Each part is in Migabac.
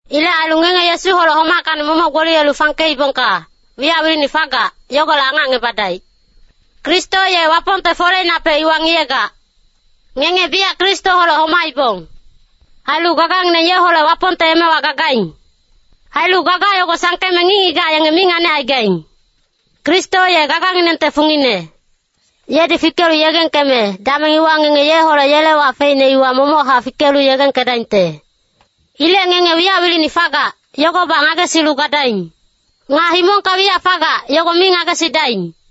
Ilec ailu ngenge Yesuholec homackacni momoc gboliyelu fangkeibongka, wiyac wilini fagac, yogolec angacngebadaic. Kristo ye Wapongte foleinapec iwa ngiyegac. Ngenge biyac Kristoholec homaibong. Ailu gagangineng yeholec Wapongte emewa gagaing. Ailu gaga yogo sangkeme ngic-ngigac yenge mi nganicaigaing. Kristo ye gaganginengte fungine. Yedi fikelu yegengkeme, dameng iwa ngenge yeholec yele wac feicne iwa momochac fikelu yegengkedaingte. Ilec ngenge wiyac wilini fagac, yogobac ngagesilu gadaing. Nga himongka wiyac fagac, yogo mi ngagesidaing.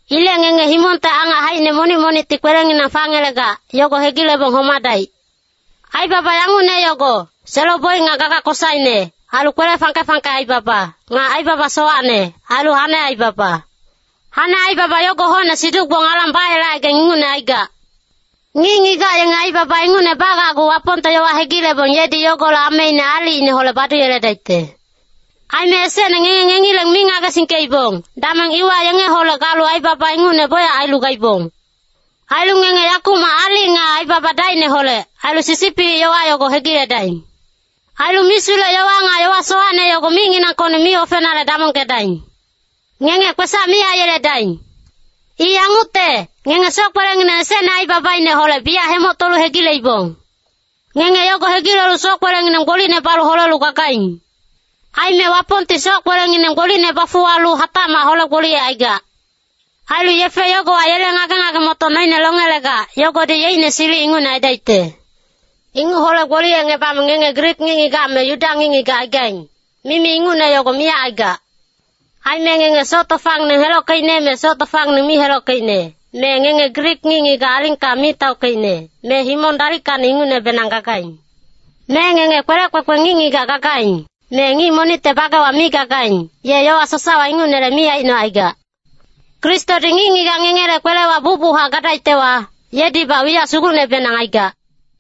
Ilec ngenge himongte angac haicine monic-monicti kwelenginang fangelegac, yogo hegilebong homadaic. Aibaba yangucne yogo, selo-boic nga gaga kosaine, ailu kwele fangke-fangke aibaba, nga aibaba sowacne, ailu hane aibaba. Hane aibaba yogo hocne siduc-gbong alang bayelecaigaing ingucne aigac. Ngic-ngigac yenge aibaba ingucne bagacgu Wapongte yowa hegilebong yedi yogolec ameine aalicineholec baduyeledaicte. Aime esecne ngenge ngengileng mi ngagesingkeibong, dameng iwa yengeholec galu aibaba ingucne bocyac ailu gaibong. Ailu ngenge yakumac aalic nga aibaba dacineholec, ailu sisipilic yowa yogo hegiledaing. Ailu misulec-yowa nga yowa sowacne yogo micnginangkocni mi ofenale damongkedaing. Ngenge kwesac mi aiyeledaing. I yangucte, ngenge soc-kwelengineng esecne aibabaineholec biyac hemoctolu hegileibong. Ngenge yogo hegilelu soc-kwelengineng gbolicne balu holelu gagaing. Aime Wapongti soc-kwelengineng gbolicne bafuwalu hatacmac hole-gboliyecaigac. Ailu yefe yogowa yele ngage-ngage-motoc noine longelegac, yogodi yeicne silic ingucne aidaicte. Inguc hole-gboliyecngebame ngenge Grik ngic-ngigac me Yuda ngic-ngigac aigaing, mimi ingucne yogo miyac aigac. Aime ngenge soc tofangineng helockeicne me soc tofangineng mi helockeicne, me ngenge Grik ngic-ngigac alingka mi taockeicne, me himong dalickacni ingucnebenang gagaing. Me ngenge kwelec kwekwe ngic-ngigac gagaing, me ngic monicte bagewa mi gagaing, ye yowa sasawa ingucnele mi aicnocaigac. Kristodi ngic-ngigac ngengele kwelewa bucbuchac gadaictewa, yedibac wiyac sugucnebenang aigac.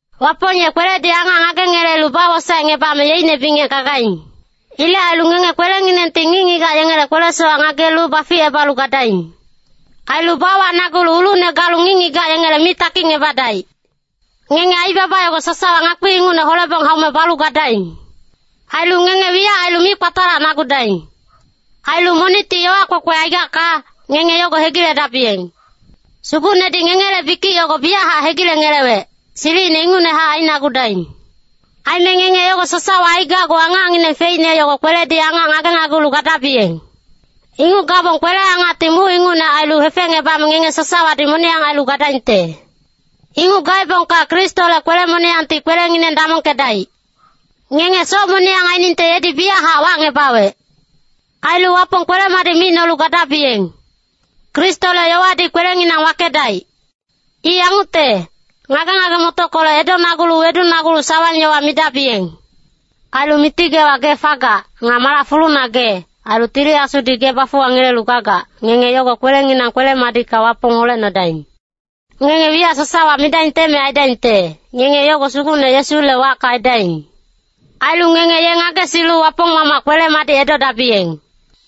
Wapong ye kweledi angac ngagengelelu bawosaecngebame yeicne bingec gagaing. Ilec ailu ngenge kwelenginengti ngic-ngigac yengele kwele-sowac ngagelu baficebalu gadaing. Ailu bawacnagulu ulucne galu ngic-ngigac yengele mi takicngebadaic. Ngenge aibaba yogo sasawa ngakpi ingucne holebong haume balu gadaing. Ailu ngenge wiyac ailu mi kpatalacnagudaing. Ailu monicti yowa kwekwe aigacka, ngenge yogo hegiledabiyeng. Sugucnedi ngengele bikic yogo biyachac hegilengelewec, silicine ingucnehac ainagudaing. Aime ngenge yogo sasawa aigacgu angacngineng feicne yogo kweledi angac ngagenagulu gadabiyeng. Inguc gabong kwele-angacti muc ingucne ailu hefecngebame ngenge sasawadi moniyang ailu gadaingte. Inguc gaebongka Kristole kwele-moniyangti kwelengineng damongkedaic. Ngenge soc moniyang inguc ainingte yedi biyachac wacngebawec. Ailu Wapong kwele-madic micnolu gadabiyeng. Kristole yowadi kwelenginang wakedaic. I yangucte, ngage-ngage-motockolec edonagulu wedunagulu sawang-yowa midabiyeng. Ailu Miti geewa gee fagac, nga malac fuluna gee, ailu Tili Asudi gee bafuwangelelu gagac, ngenge yogo kwelenginang kwele-madicka Wapong holecnodaing. Ngenge wiyac sasawa midaingte me aidaingte, ngenge yogo Sugucne Yesule wacka aidaing. Ailu ngenge ye ngagesilu Wapong Mamac kwele-madic edodabiyeng.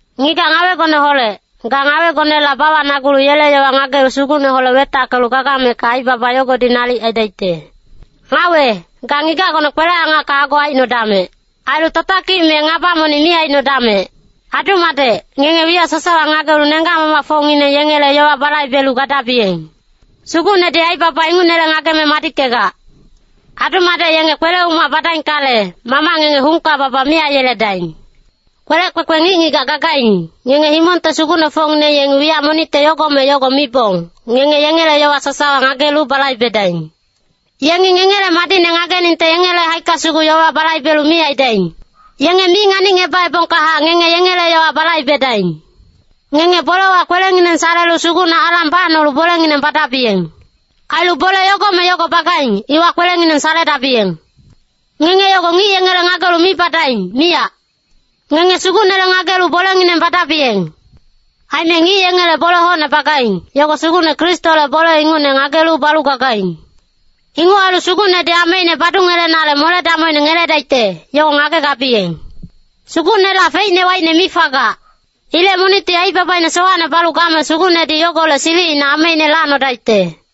Ngigac ngawegoneholec, ga ngawegonela bawacnagulu yele yowa ngagelu Sugucneholec wetackelu gagamecka aibaba yogodi nalic aidaicte. Ngawe, ga ngigacgone kwele-angacka ago aicnodamec. Ailu tatakic me ngaba monic mi aicnodamec. Adu-madec, ngenge wiyac sasawa ngagelu nenggac-mamacfocngineng yengele yowa balaibelu gadabiyeng. Sugucnedi aibaba ingucnele ngageme madickegac. Adu-madec yenge kwele-umac badaingkale, mamac ngenge hungka baba mi aiyeledaing. Kwelec kwekwe ngic-ngigac gagaing, ngenge himongte sugucnefocngineng yengi wiyac monicte yogo me yogo mibong, ngenge yengele yowa sasawa ngagelu balaibedaing. Yengi ngengele madicne ngageningte yengele haicka sugu yowa balaibelu mi aidaing. Yenge mi nganicngebaebongkahac ngenge yengele yowa balaibedaing. Ngenge bolewa kwelengineng salelu Sugucne alang bacnolu bolengineng badabiyeng. Ailu bole yogo me yogo bagaing, iwa kwelengineng saledabiyeng. Ngenge yogo ngic yengele ngagelu mi badaing, miyac. Ngenge Sugucnele ngagelu bolengineng badabiyeng. Aime ngic yengele bole hocne bagaing, yogo Sugucne Kristole bole ingucne ngagelu balu gagaing. Inguc ailu Sugucnedi ameine badungelenale mole-damocine ngeledaicte, yogo ngagegabiyeng. Sugucnela feicne waicne mi fagac. Ilec monicti aibabaine sowacne balu game Sugucnedi yogolec silicina ameine lacnodaicte.